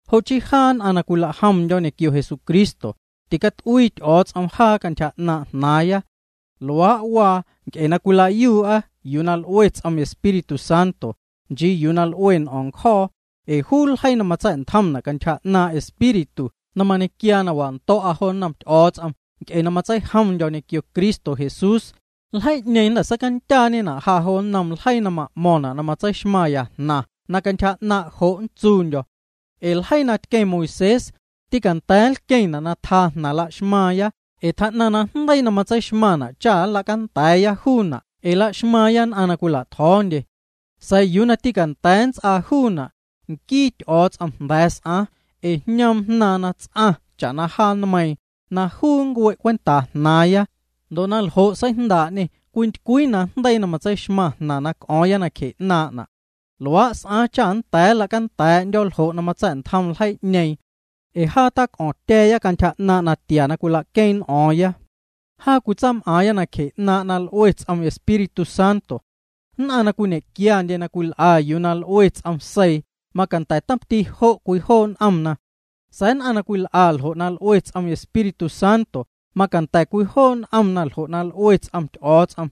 Jo chii jaa nn'aⁿ na cwilajomndyo̱ ñequio Jesucristo, ticat'uii Ty'o̱o̱ts'om jaa cantyja 'naaⁿ' jnaaⁿya. Luaa' waa nc'e na cwil'aaya yuu na l'ue ts'om Espíritu Santo, nchii yuu na l'ue n'o̱o̱ⁿ ncjo̱o̱. Ee juu ljeii na matsa̱'ntjomna' cantyja 'naaⁿ' Espíritu na mañequiaa na wando̱'a jo nnom Ty'o̱o̱ts'om nc'e na matseijomndyo̱ ñequio Cristo Jesús, ljeii'ñeeⁿ jnda̱ seicandyaañena' ja jo nnom ljeii na ma'mo̱ⁿna' na matseixmaⁿya jnaⁿ na cantyja 'naaⁿ' jo' nntsuundyo̱. Ee ljeii na tqueⁿ Moisés, tîcanda̱a̱ nlqueⁿna' na tjaa jnaⁿ laxmaaⁿya ee tjaa'naⁿ najndeii na matseixmaⁿna' cha nla'canda̱a̱ya juuna' ee la'xmaaⁿya nn'aⁿ na cwila'tjo̱o̱ndye. Sa̱a̱ yuu na tîcanda̱a̱ nnts'aa juuna', nquii Ty'o̱o̱ts'om jnda̱ s'aaⁿ. Ee jñoom Jnaaⁿ na ts'aⁿ cha'na jaa nmeiiⁿ, na juu nncue' cwentaa jnaaⁿya. Ndo' na ljo' seijndaa'ñê na cwintycwii najndeii na matseixmaⁿ jnaⁿ na c'o̱o̱ⁿya nacje 'naaⁿ'na'. Luaa' s'aaⁿ cha nnda̱a̱ nla'canda̱a̱ya ljo' na matsa̱'ntjom ljeii'ñeeⁿ. Ee jaa tac'o̱ⁿtya̱a̱ya cantyja 'naaⁿ' natia na cwila'queeⁿ n'o̱o̱ⁿya. Jaa cwitsaam'aaⁿya nacje 'naaⁿ' na l'ue ts'om Espíritu Santo. Nn'aⁿ na cwiñe'quiandye na cwil'a yuu na l'ue ts'om seii macanda̱ tomti jo' cwijoo' n'omna. Sa̱a̱ nn'aⁿ na cwil'a ljo' na l'ue ts'om Espíritu Santo macanda̱ cwijoo' n'omna ljo' na l'ue ts'om Ty'o̱o̱ts'om.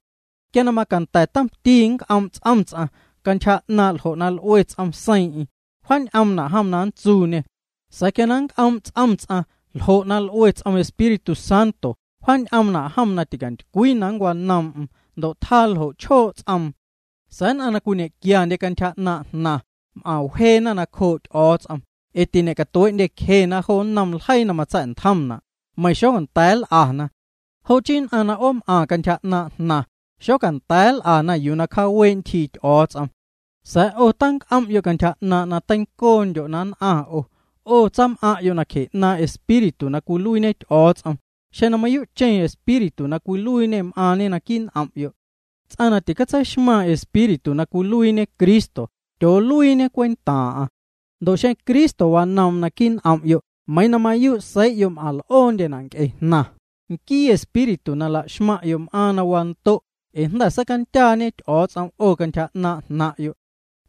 Quia na macanda̱ tomti nnc'oom' ts'om ts'aⁿ cantyja 'naaⁿ' ljo' na l'ue ts'om seiiⁿ'eⁿ, wjaañ'omna' jom na nntsuuñê. Sa̱a̱ quia na nnc'oom' ts'om ts'aⁿ ljo' na l'ue ts'om Espíritu Santo wjaañ'oomna' jom na ticantycwii na nncwanoom'm ndo' tjaa ljo' chjoo' ts'oom. Sa̱a̱ nn'aⁿ na cwiñequiandye cantyja 'naaⁿ' jnaⁿ, m'aⁿwjeena nacjoo' Ty'o̱o̱ts'om, ee tiñe'catuee'ndyecjena jo nnom ljeii na matsa̱'ntjomna', meiⁿ xonda̱a̱ nl'ana. Jo' chii nn'aⁿ na 'oom'aⁿ cantyja 'naaⁿ' jnaⁿ, xocanda̱a̱ nl'ana yuu na cjaawee' ntyjii Ty'o̱o̱ts'om. Sa̱a̱ 'o tac'om'yo' cantyja 'naaⁿ' na teincoondyo' na nn'aⁿ, 'o tsaam'aⁿ'yo' nacje 'naaⁿ' Espíritu na cwiluiiñe Ty'o̱o̱ts'om, xeⁿ na mayuu'cheⁿ Espíritu na cwiluiiñê m'aaⁿñe naquii' n'om'yo'. Ts'aⁿ na ticatseixmaⁿ Espíritu na cwiluiiñe Cristo tyooluiiñe cwentaaⁿ'aⁿ. Ndo' xeⁿ Cristo wanoom'm naquii' n'om'yo' meiiⁿ na mayuu' seii'yo' m'aⁿl'oondyena' nc'e jnaⁿ, nquii espíritu na la'xmaⁿ'yo' m'aaⁿ na wando' ee jnda̱ seicandyaañe Ty'o̱o̱ts'om 'o cantyja 'naaⁿ' jnaⁿ'yo'.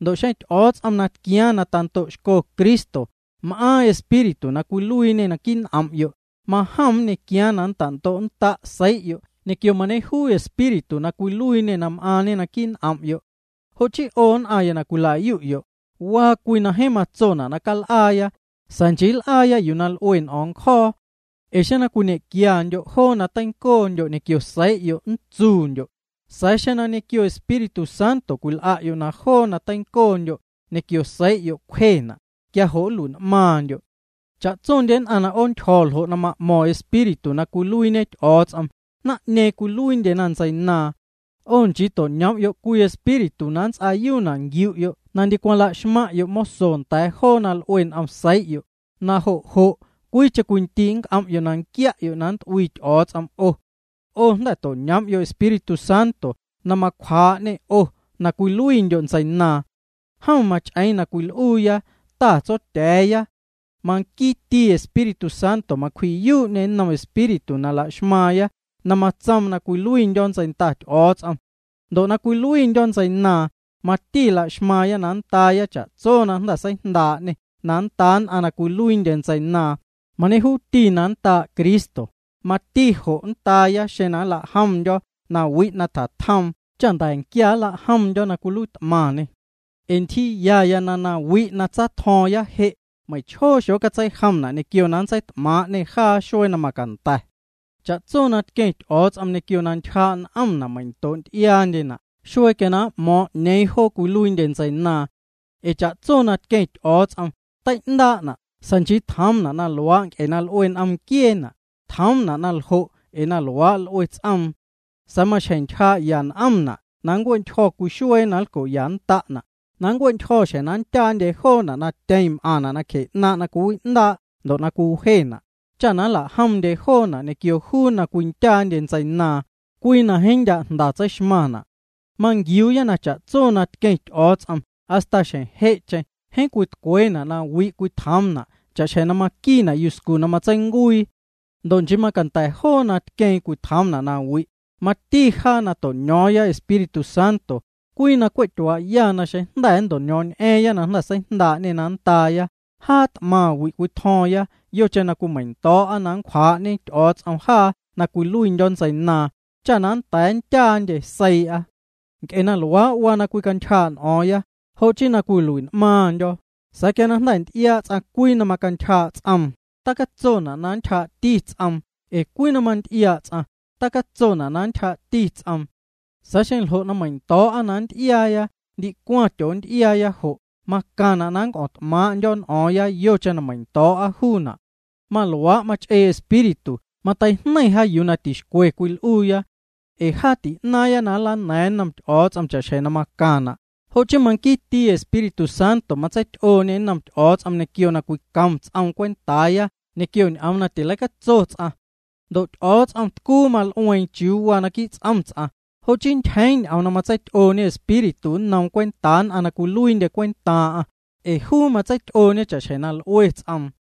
Ndo' xeⁿ Ty'o̱o̱ts'om na tquiaaⁿ na tando'xco Cristo m'aaⁿ Espíritu na cwiluiiñê naquii' n'om'yo', majom nñequiaaⁿ na nnta'ndo'nnda' seii'yo' ñequio mañejuuti Espíritu na cwiluiiñê m'aaⁿñe naquii' n'om'yo'. Jo' chii 'o nn'aⁿya na cwila'yu'yo', waa cwii na jeeⁿ matsona' na cal'aaya, sa̱a̱ nchii nl'aya yuu na l'ue n'o̱o̱ⁿ ncjo̱o̱. Ee xeⁿ na cwiñequiandyo' joo na teincoondyo' ñequio seii'yo' nntsuundyo', sa̱a̱ xeⁿ ñequio Espíritu Santo cwil'a'yo' na joo na teincoondyo' ñequio seii'yo' cwjena', quia jo' nlui'n'maaⁿndyo'. Cha'tsondye nn'aⁿ na 'oontyjo̱ ljo' na ma'mo̱ⁿ Espíritu na cwiluiiñe Ty'o̱o̱ts'om, naⁿ'ñeeⁿ cwiluiindyena ntseinaaⁿ. 'O nchii to'ñoom'yo' cwii espíritu na nnts'aayuuna' nquiu'yo' na ndicwaⁿ la'xmaⁿ'yo' moso nda̱a̱ joo na l'ue n'om seii'yo', na jo' jo' cwiicheⁿ cwiindii' nnc'om'yo' na nquia'yo' na nnt'uii Ty'o̱o̱ts'om 'o. 'O jnda̱ to'ñoom'yo' Espíritu Santo na macjwaa'ñe 'o na cwiluiindyo' ntseinaaⁿ. Jom mach'eeⁿ na cwil'uuya: “Ta Tsotya̱a̱ya.” Manquiiti Espíritu Santo macwji'yuu'ñê nnom espíritu na laxmaaⁿya na matsoom na cwiluiindyo̱ ntseinda Ty'o̱o̱ts'om. Ndo' na cwiluiindyo̱ ntseinaaⁿ, mati la'xmaaⁿya na nndaaya cha'tso na jnda̱ seijndaa'ñê na nndaa nn'aⁿ na cwiluiindye ntseinaaⁿ, mañejuuti na nndaa' Cristo, mati jo' nndaaya xeⁿ cwilajomndyo̱ nawi' na tjatjoom cha nda̱nquia nlajomndyo̱ na cwiluiit'maⁿñê. Ee ntyjiiyaya na nawi' na tsatjo̱o̱ⁿya je', meiⁿchjoo xocatseijomna' ñequio na nntseit'maaⁿ'ñena' jaa xuee na macanda̱. Cha'tso na tqueⁿ Ty'o̱o̱ts'om ñequio na ntyjaa' n'omna meiⁿ'ndoo'nty'iaandye xuee quia na m'mo̱o̱ⁿ 'ñeeⁿ joo cwiluiindye na nntseinaaⁿ. Ee cha'tso na tqueⁿ Ty'o̱o̱ts'om tei'ndaa'na' sa̱a̱ nchii tjoomna' na luaa' ee na l'ue n'om nquieena', tjoomna' na ljo' ee luaa' l'ue ts'oom. Sa̱a̱ maxjeⁿ ntyjaa'ya n'omna' na nncue'ntyjo̱ cwii xuee na nlco'yannda'na', na nncue'ntyjo̱ xjeⁿ na nndyaandye joona' na tyeⁿ m'aⁿna' nacje 'naaⁿ' na cwiwi'ndaa'na' ndo' cwiwjena', cha nla'jomndye joona' ñequio juu na cwindyaandye ntseinaaⁿ, cwii na jeeⁿ ndya' jnda tseixmaⁿna'. Manquiuuya na cha'tso na tqueⁿ Ty'o̱o̱ts'om hasta xjeⁿ je'cheⁿ jeeⁿ cwitcweena' nawi' cwitjoom joona' cha'xjeⁿ maquiina' yuscu na matseincuii. Ndo' nchii macanda̱ joo na tqueeⁿ cwitjoomna' na wi', mati jaa na jnda̱ to'ño̱o̱ⁿya Espíritu Santo, cwii na cwe' tyuaa'ya na xeⁿ jnda̱ nnto'ño̱o̱ⁿñ'a̱a̱ⁿ na jnda̱ seijndaa'ñê na nndaaya, jaa t'maⁿ wi' cwitjo̱o̱ⁿya yocheⁿ na cwimeiⁿndo̱o̱'a na nncwjaa'ñe Ty'o̱o̱ts'om jaa na cwiluiindyo̱ ntseinaaⁿ, cha na nnda̱a̱ nndyaandye seii'a. Nc'e na luaa' waa na cwicantyjaa' n'o̱o̱ⁿya, jo' chii na cwilui'n'maaⁿndyo̱, sa̱a̱ quia jnda̱ nty'iaa' ts'aⁿ cwii na macantyjaa' ts'oom, tacatsona' na ntyjaa'ti ts'oom ee cwii na mamanty'iaa' ts'aⁿ, ticatsona' na ntyjaa'ti ts'oom. Sa̱a̱ xeⁿ ljo' na meiⁿndo̱o̱'a na nnty'iaaya ndicwaⁿ tyoonty'iaaya jo', macaⁿna' na c'o̱ⁿt'maaⁿ'ndyo̱ n'o̱o̱ⁿya yocheⁿ na meiⁿndo̱o̱'a juuna'. Maluaa' mach'ee Espíritu, mateijneiⁿ jaa yuu na tixcwe cwil'uuya. Ee jaa ti'naaⁿya nlana̱a̱ⁿya nnom Ty'o̱o̱ts'om cha'xjeⁿ na macaⁿna', jo' chii manquiiti Espíritu Santo matseity'ooñê nnom Ty'o̱o̱ts'om ñequio na cwicom ts'oom cwentaaya ñequio ñ'oom na tileicatso ts'aⁿ. Ndo' Ty'o̱o̱ts'om tcuu mal'ueeⁿ chiuu waa naquii' ts'om ts'aⁿ, jo' chii ntyjeeⁿ ñ'oom na matseity'ooñe Espíritu nnoom cwentaa nn'aⁿ na cwiluiindye cwentaaⁿ'aⁿ, ee juu matseity'ooñe cha'xjeⁿ na l'ue ts'oom.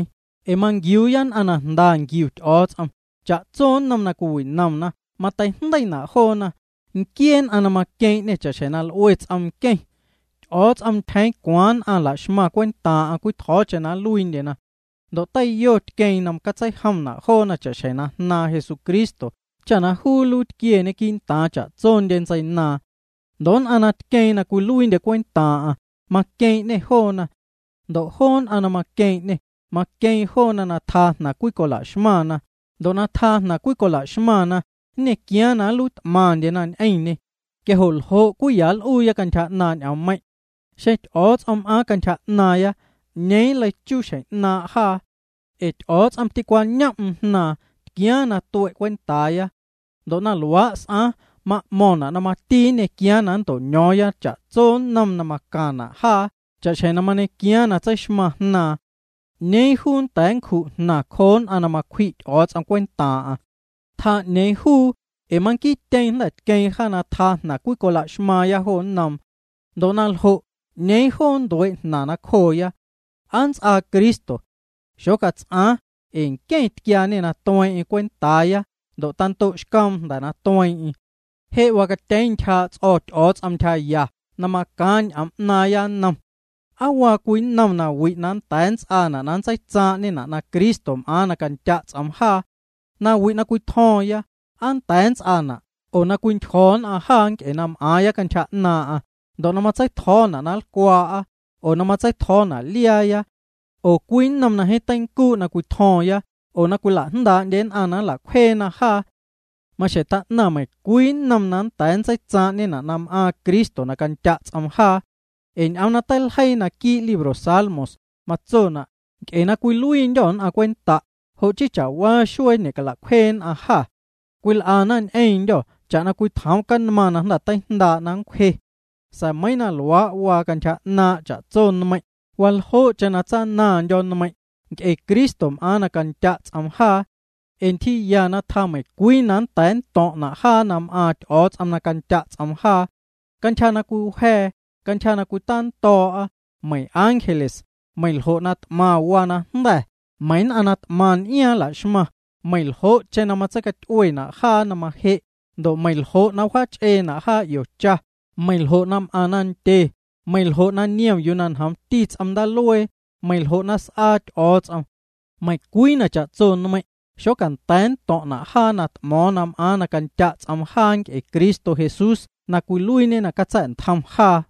Ee manquiuuya nn'aⁿ na jnda nquiu Ty'o̱o̱ts'om, cha'tso nnom na cwiwi'nomna cwitei'jndeiina' joona, nquiee nn'aⁿ na maqueeⁿ'ñê cha'xjeⁿ na l'ue ts'om nqueⁿ. Ty'o̱o̱ts'om ntyjeeⁿ cwaaⁿ nn'aⁿ nla'xmaⁿ cwentaaⁿ'aⁿ cwitjo̱o̱cheⁿ na nluiindyena. Ndo' teiyo tqueeⁿ na catseijomna' joona cha'xjeⁿ na Jnaaⁿ Jesucristo cha na juu nluiitquieñe quii'ntaaⁿ cha'tsondye ntseinaaⁿ. Ndo' nn'aⁿ na tqueeⁿ na cwiluiindye cwentaaⁿ'aⁿ, maqueeⁿ'ñê joona. Ndo' joo nn'aⁿ na maqueeⁿ'ñê, maqueeⁿ joona na tjaa jnaⁿ cwicola'xmaⁿna, ndo' na tjaa jnaⁿ cwicola'xmaⁿna, nñequiaaⁿ na nluiit'maⁿndyena ñ'eⁿñê. Quia jo' ¿ljo' cwii ya nl'uuya cantyja 'naaⁿ' ñ'oommeiⁿ'? Xeⁿ Ty'o̱o̱ts'om m'aaⁿ cantyja 'naaⁿya, ¿'ñeeⁿ nleichuu xjeⁿ 'naaⁿ' jaa? Ee Ty'o̱o̱ts'om tîcwañom'm Jnaaⁿ, tquiaaⁿ na tue' juu cwentaaya. Ndo' na luaa' s'aaⁿ, ma'mo̱ⁿna' na mati nñequiaaⁿ na nnto'ño̱o̱ⁿya cha'tso nnom na macaⁿna' jaa cha'xjeⁿ mañequiaaⁿ na tseixmaⁿ Jnaaⁿ. ¿'Ñeeⁿ juu nnda̱a̱ nncju' jnaⁿ cjoo nn'aⁿ na macwji' Ty'o̱o̱ts'om cwentaaⁿ'aⁿ? Tjaa 'ñeeⁿ juu ee manquiityeeⁿ jnda̱ tqueeⁿ jaa na tjaa jnaⁿ cwicola'xmaaⁿya jo nnoom. Ndo' na ljo' ¿'ñeeⁿ joo nntuee' jnaⁿ nacjoona? ¿Aa nnts'aa Cristo? Xocats'aaⁿ ee nqueⁿ tquiaañê na tueeⁿ'eⁿ cwentaaya ndo' tando'xcoom jnda̱ na tueeⁿ'eⁿ. Je' wacatyeeⁿ ntyjaa' ts'o̱ Ty'o̱o̱ts'om ntyjaya na macaaⁿ ñ'oom 'naaⁿya nnom. ¿Aa waa cwii nnom nawi' na nnda̱a̱ nnts'aana' na nntseitsaaⁿ'ñena' na Cristo m'aaⁿ na candya' ts'oom jaa? Nawi' na cwitjo̱o̱ⁿya, ¿aa nnda̱a̱ nnts'aana' oo na cwintyjo̱ nn'aⁿ jaa nc'e na m'aaⁿya cantyja 'naaⁿ'aⁿ, ndo' na matsei'tjo̱o̱na' na nlcwaa'a, oo na matsei'tjo̱o̱na' liaaya? Oo, ¿cwii nnom na jeeⁿ teincuu' na cwitjo̱o̱ⁿya oo na cwila'jndaa'ndye nn'aⁿ na nla'cwjeena jaa? Maxjeⁿ tjaa'naⁿ meiⁿcwii nnom na nnda̱a̱ nntseitsaaⁿ'ñena' na m'aaⁿ Cristo na candya' ts'oom jaa. Ee ñ'oom na teiljeii naquii' libro Salmos, matsona': Nc'e na cwiluiindyô̱ nn'aⁿ cwenta', jo' chii meinchaa' xuee na ñe'cala'cwjee nn'aⁿ jâ. Cwil'ana ñ'eⁿndyô̱ cha'na cwitjoom canmaⁿ na jnda̱ teijndaa' na nncwje. Sa̱a̱ meiiⁿ na luaa' waa cantyja 'naaⁿ' cha'tso nmeiⁿ', waljoo'cheⁿ na tsanandyo̱ nmeiⁿ', nc'e Cristo m'aaⁿ na candya' ts'oom jaa. Ee ntyjiiya tjaa meiⁿcwii na nnda̱a̱ nnto̱ⁿ'na' jaa na m'aaⁿ Ty'o̱o̱ts'om na candya' ts'oom jaa. Cantyja na cwiwja̱a̱, cantyja na cwitando̱o̱'a, meiⁿ ángeles, meiⁿ ljo' na t'maⁿ waa najnda̱, meiⁿ nn'aⁿ na t'maⁿ n'iaaⁿ la'xmaⁿ, meiⁿ ljo'cheⁿ na matseicaty'uena' jaa na maje', ndo' meiⁿ ljo' na wjaach'eena' jaa 'io cha, meiⁿ ljo' na m'aⁿ nandye, meiⁿ ljo' na niom yuu na njoomti ts'om ndaaluee, meiⁿ ljo' na s'aa Ty'o̱o̱ts'om. Meiⁿcwii na cha'tso nmeiⁿ', xocanda̱a̱ nnto̱ⁿ'na' jaa na t'mo̱o̱ⁿ na m'aaⁿ na candya' ts'oom jaa nc'e Cristo Jesús na cwiluiiñê na catsa̱'ntjoom jaa.